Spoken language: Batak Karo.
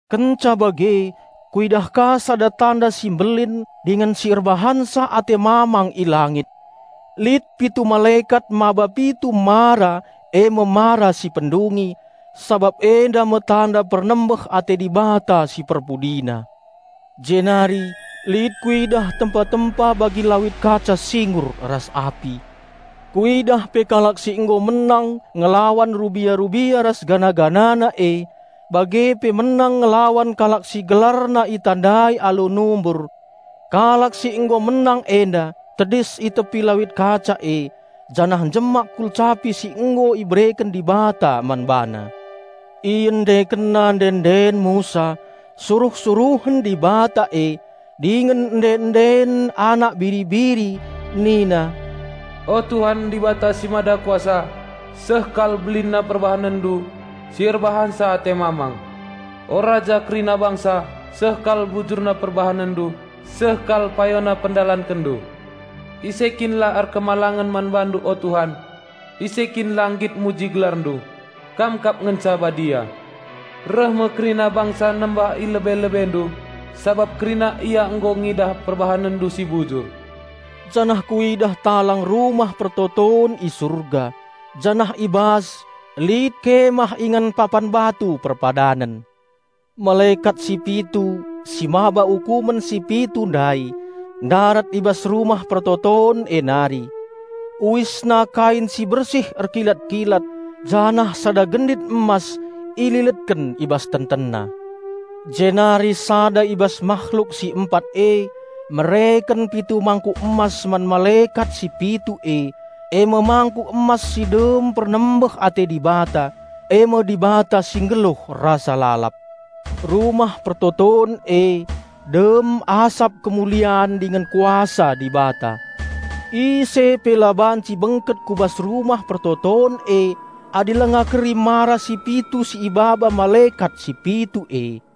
Kenca bage, kuidah ka sada tanda si mbelin dingen si erbahanca ate mamang i langit. Lit pitu malekat mbaba pitu mara e me mara si pendungi, sabap enda me tanda pernembeh ate Dibata si perpudina. Jenari lit kuidah tempa-tempa bagi lawit kaca singgur ras api. Kuidah pe kalak si nggo menang ngelawan rubia-rubia ras patungna e, bage pe menang ngelawan kalak si gelarna itandai alu numbur. Kalak si nggo menang enda tedis i tepi lawit kaca e janah njemak kulcapi si nggo ibereken Dibata man bana. Iendekenna ende-enden Musa, suruh-suruhen Dibata e, dingen ende-enden Anak Biri-biri nina, "O Tuhan, Dibata si Mada Kuasa, seh kal belinna PerbahanenNdu si erbahanca ate mamang. O Raja kerina bangsa, seh kal adilna ras payona si IdalankenNdu. Ise kin si la erkemalangen man BaNdu o Tuhan? Ise kin si la nggit muji GelarNdu? Kam kap ngenca Badia. Reh me kerina bangsa nembah i lebe-LebeNdu, sabap kerina ia nggo ngidah PerbahanenNdu si adil." Janah kuidah talang Rumah Pertoton i Surga, janah i bas lit kemah ingan Papan Batu Perpadanen. Malekat si pitu si maba ukumen si pitu ndai ndarat i bas Rumah Pertoton e nari. Uisna kain si bersih erkilat-kilat janah sada gendit emas ililetken i bas tentenna. Jenari sada i bas mahluk si empat e mereken pitu mangkuk emas man malekat si pitu e, e me mangkuk emas si dem pernembeh ate Dibata, e me Dibata si nggeluh rasa lalap. Rumah Pertoton e dem asap kemulian dingen Kuasa Dibata. Ise pe la banci bengket ku bas Rumah Pertoton e adi langa keri mara si pitu si ibaba malekat si pitu e.